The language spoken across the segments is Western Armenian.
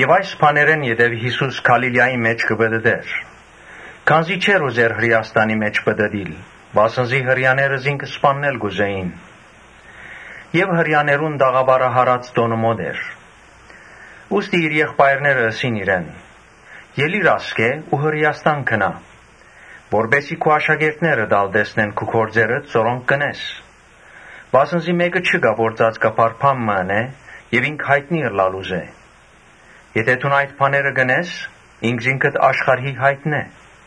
Այս բաներէն ետքը Յիսուս Գալիլիայի մէջ կը պտըտէր, քանզի չէր ուզեր Հրէաստանի մէջ պտըտիլ, վասն զի Հրեաները զինք սպաննել կ’ուզէին։ Հրեաներուն տաղաւարահարաց տօնը մօտ էր, Ուստի իր եղբայրները ըսին իրեն. «Ելի՛ր ասկէ ու Հրէաստան գնա, որպէս զի քու աշակերտներդ ալ տեսնեն քու գործերդ որոնք կ’ընես. Վասն զի մէկը չկայ որ ծածկաբար բան մը ընէ եւ ինք յայտնի ըլլալ ուզէ. եթէ դուն այդ բաները կ’ընես, ինքզինքդ աշխարհի յայտնէ»։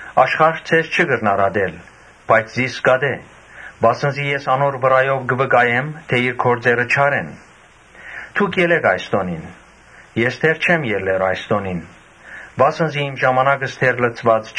Աշխարհ ձեզ չի կրնար ատել, բայց զիս կ’ատէ, վասն զի ես կը վկայեմ թէ իր գործերը չար են։ Դուք ելէ՛ք այս տօնին. ես [դեռ] չեմ ելլեր այս տօնին. վասն զի ժամանակս դեռ չէ լեցուած»։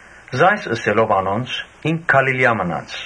Այս ըսելով անոնց՝ ինք Գալիլիա մնաց։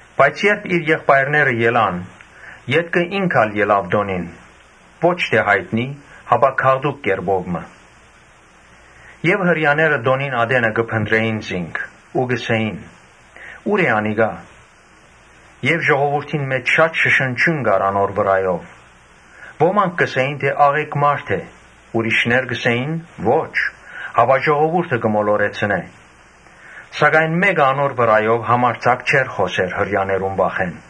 Բայց երբ իր եղբայրները գացին, ետքը ինք ալ գնաց տօնին, ո՛չ թէ յայտնի՝ հապա գաղտուկ կերպով մը։ Հրեաները տօնին ատենը կը փնտռէին զինք ու կ’ըսէին. «Ո՞ւր է անիկա»։ Եւ ժողովուրդին մէջ շատ շշնջիւն կար անոր վրայով։ Ոմանք կ’ըսէին թէ ‘Աղէկ մարդ է’. ուրիշներ կ’ըսէին. ‘Ոչ, հապա ժողովուրդը կը մոլորեցնէ’։ Սակայն մէ՛կը անոր վրայով համարձակ չէր խօսեր Հրեաներուն վախէն։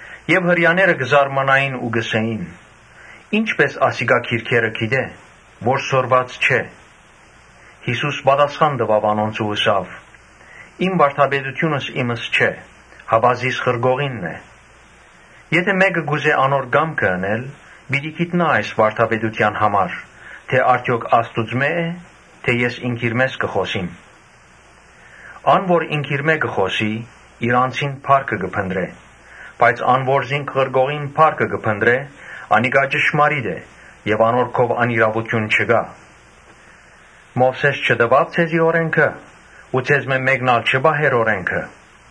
Հրեաները կը զարմանային ու կ’ըսէին. «Ի՞նչպէս ասիկա գրքերը գիտէ, որ սորված չէ»։ Յիսուս պատասխան տուաւ անոնց ու ըսաւ. «Իմ վարդապետութիւնս իմս չէ, հապա զիս ղրկողինն է։ Եթէ մէկը կ’ուզէ անոր կամքը ընել, պիտի գիտնայ այս վարդապետութեան համար թէ արդեօք Աստուծմէ՞ է՝ թէ ես ինքնիրմէս կը խօսիմ։ Ան որ ինքնիրմէ կը խօսի, իր անձին փառքը կը փնտռէ, բայց ան որ զինք ղրկողին փառքը կը փնտռէ, անիկա ճշմարիտ է եւ անոր քով անիրաւութիւն չկայ։ Մովսէս չտուա՞ւ ձեզի օրէնքը ու ձեզմէ մէ՛կն ալ չի պահեր օրէնքը։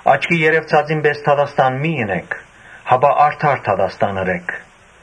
Աչքի երեւցածին պէս դատաստան մի՛ ընէք, հապա արդար դատաստան ըրէք»։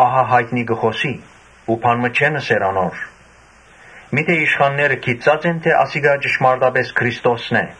Ահա յայտնի կը խօսի ու բան մը չեն ըսեր անոր. միթէ իշխանները հասկցա՞ն թէ ասիկա ճշմարտապէս Քրիստոսն է։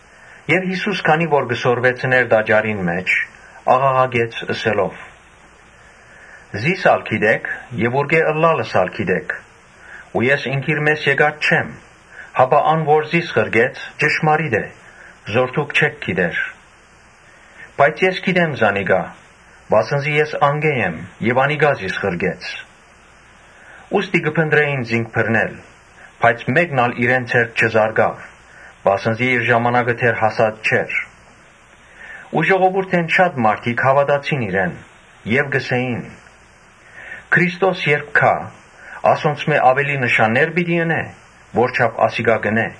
Եւ Յիսուս տաճարին մէջ աղաղակեց՝ սորվեցնելու ատեն. «Զի՛ս ալ կը ճանչնաք եւ ուրկէ՛ ըլլալս ալ գիտէք։ Ես ինքնիրմէս եկած չեմ, հապա ան որ զիս ղրկեց՝ ճշմարիտ է, որ դուք չէք ճանչնար։ Բայց ես կը ճանչնամ զանիկա, վասն զի ես անկէ եմ եւ անիկա զիս ղրկեց»։ Ուստի կը մտածէին զինք բռնել, բայց մէ՛կն ալ իրեն ձեռք չզարկաւ, վասն զի իր ժամանակը դեռ հասած չէր։ Ժողովուրդէն շատեր հաւատացին իրեն եւ կ’ըսէին. «Քրիստոս երբ գայ, ասոնցմէ աւելի նշաննե՞ր պիտի ընէ, որչափ ասիկա կ’ընէ»։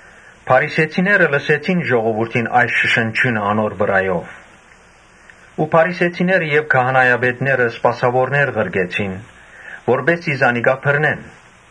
Փարիսեցիները լսեցին ժողովուրդին այս շշնջիւնը անոր վրայով։ Անոնք եւ քահանայապետները սպասաւորներ ղրկեցին, որպէս զի զանիկա բռնեն։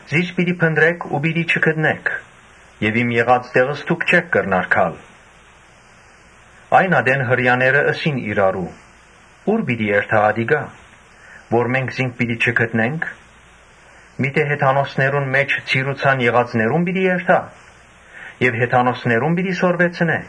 Զիս պիտի փնտռէք ու պիտի չգտնէք եւ իմ եղած տեղս դուք չէք կրնար գալ»։ Այն ատեն Հրեաները ըսին իրարու. «Ո՞ւր պիտի երթայ ատիկա, որ մենք զինք պիտի չգտնենք. միթէ յուն., Յոյներունհեթանոսներուն մէջ ցիրուցան եղածներո՞ւն պիտի երթայ եւ հեթանոսներո՞ւն պիտի սորվեցնէ։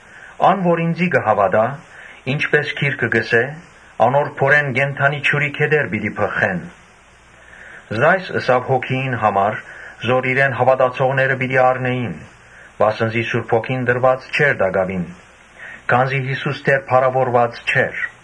Ան՝ որ ինծի հաւատայ՝ ինչպէս գիրքը կ’ըսէ. ‘Անոր փորէն կենդանի ջուրի գետեր պիտի բղխին’»։ Այս ըսաւ Հոգիին համար, որ իրեն հաւատացողները պիտի առնէին, վասն զի Սուրբ Հոգին տրուած չէր տակաւին, քանզի Յիսուս դեռ փառաւորուած չէր։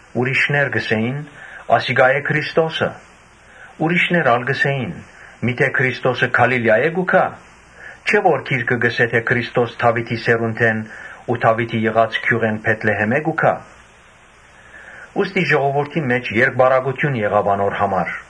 Ուրիշներ ըսին. «Ասիկա է Քրիստոսը». ուրիշներ ալ. «Միթէ Քրիստոսը Գալիլիայէ՞ն պիտի գայ։ Չէ՞ որ գիրքը կ’ըսէ թէ Քրիստոս Դաւիթին սերունդէն ու Դաւիթին եղած գիւղէն Բեթլեհէմէն պիտի գայ»։ Ուստի ժողովուրդին մէջ երկպառակութիւն եղաւ անոր համար։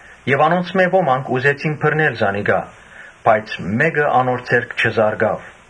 Անոնցմէ ոմանք ուզեցին բռնել զանիկա, բայց մէ՛կը անոր ձեռք չզարկաւ։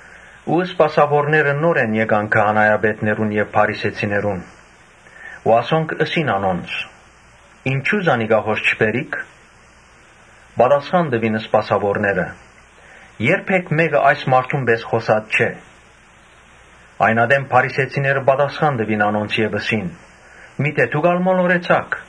Սպասաւորները նորէն գացին քահանայապետներուն եւ փարիսեցիներուն, որոնք հարցուցին. «Ինչո՞ւ զանիկա հոս չբերիք»։ Պատասխան տուին սպասաւորները. «Երբեք մէ՛կը այդ մարդուն պէս խօսած չէ»։ Այն ատեն փարիսեցիները հարցուցին անոնց եւ ըսին. «Միթէ դո՞ւք ալ մոլորեցաք։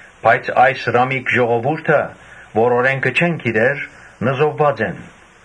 Բայց այս ռամիկ ժողովուրդը՝ որ օրէնքը չեն գիտեր, նզովուած են»։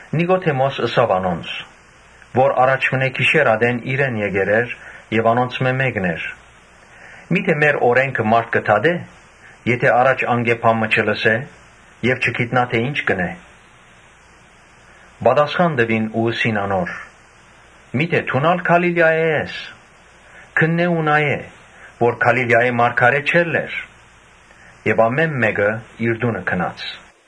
Նիկոդէմոս ըսաւ անոնց, (որ գիշեր ատեն իրեն գացեր էր եւ անոնցմէ մէկն էր,) «Միթէ մեր օրէնքը մարդ կը դատէ՞, եթէ առաջ անկէ բան մը չլսէ եւ չգիտնայ թէ ի՞նչ կ’ընէ»։ Պատասխան տուին ու ըսին անոր. «Միթէ դո՞ւն ալ Գալիլիայէն ես. քննէ՛ ու նայէ՛, որ Գալիլիայէն մարդ չելլեր»։ Եւ ամէն մէկը իր տունը գնաց։